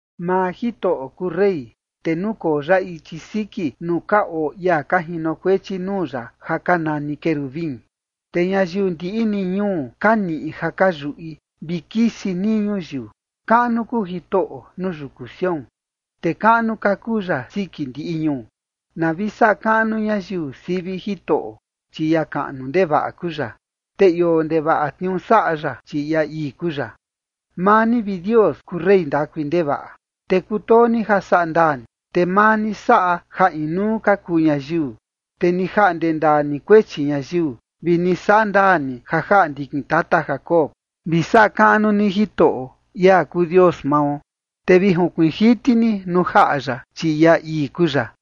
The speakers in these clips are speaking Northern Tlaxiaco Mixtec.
Maa Jitoꞌo kuu rey, te nukoo ya ichi siki nuu ka oo ia ka jinokuechi nuu ya ja ka nani querubin, te ñayiu ndiꞌi ni ñuu ka niꞌi ja ka yuꞌi, vi kisi nii ñuyiu. Kaꞌnu kuu Jitoꞌo nuu yuku Sión, te kaꞌnu ka kuu ya siki ndiꞌi ñuu. Na vi saꞌa kaꞌnu ñayiu sivi Jitoꞌo, chi ia kaꞌnu ndevaꞌa kuu ya, te ioo ndevaꞌa tniuu saꞌa ya, chi ia ii kuu ya. Maa ni, vi Dios, kuu rey ndakui ndevaꞌa, te kutoo ni ja saꞌa ndaa ni, te maa ni saꞌa ja inuu ka kuu ñayiu, te ni jaꞌnde ndaa ni kuechi ñayiu, vi ni saꞌa ndaa ni ja jaꞌa ndikin tata Jacob. Vi saꞌa kaꞌnu ni Jitoꞌo, ia kuu Dios mao, te vi junkuiin jiti ni nuu jaꞌa ya, chi ia ii kuu ya.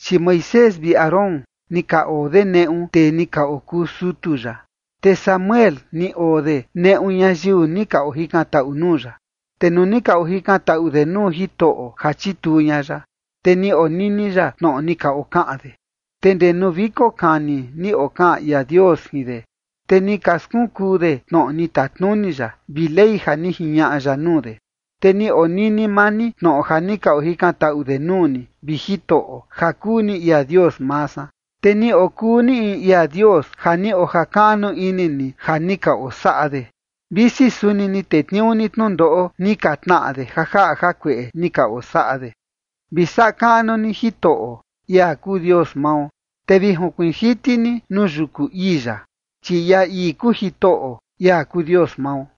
Chi Moisés vi Aarón ni ka oo de neꞌu tee ni ka okuu sutu ya, te Samuel ni oo de neꞌu ñayiu ni ka ojikantaꞌu nuu ya. Te nuu ni ka ojikantaꞌu de nuu Jitoꞌo ja chituu ña ya, te ni onini ya tnoꞌo ni ka okaꞌan de. Te ndee nuu viko kani ni okaꞌan ia Dios jin de, te ni ka skunkuu de tnoꞌo ni tatnuni ya, vi ley ja ni jiñaꞌa ya nuu de. Te ni onini maa ni tnoꞌo ja ni ka ojikantaꞌu de nuu ni, vi Jitoꞌo, ja kuu ni ia Dios maa san, te ni okuu ni in ia Dios ja ni ojakaꞌnu ini ni ja ni ka osaꞌa de, visi suni ni tetniuu ni tnundoꞌo ni ka tnaꞌa de ja jaꞌa jakueꞌe ni ka osaꞌa de. Vi saꞌa kaꞌnu ni Jitoꞌo, ia kuu Dios mao, te vi junkuiin jiti ni nuu yuku ii ya, chi ia ii kuu Jitoꞌo, ia kuu Dios mao.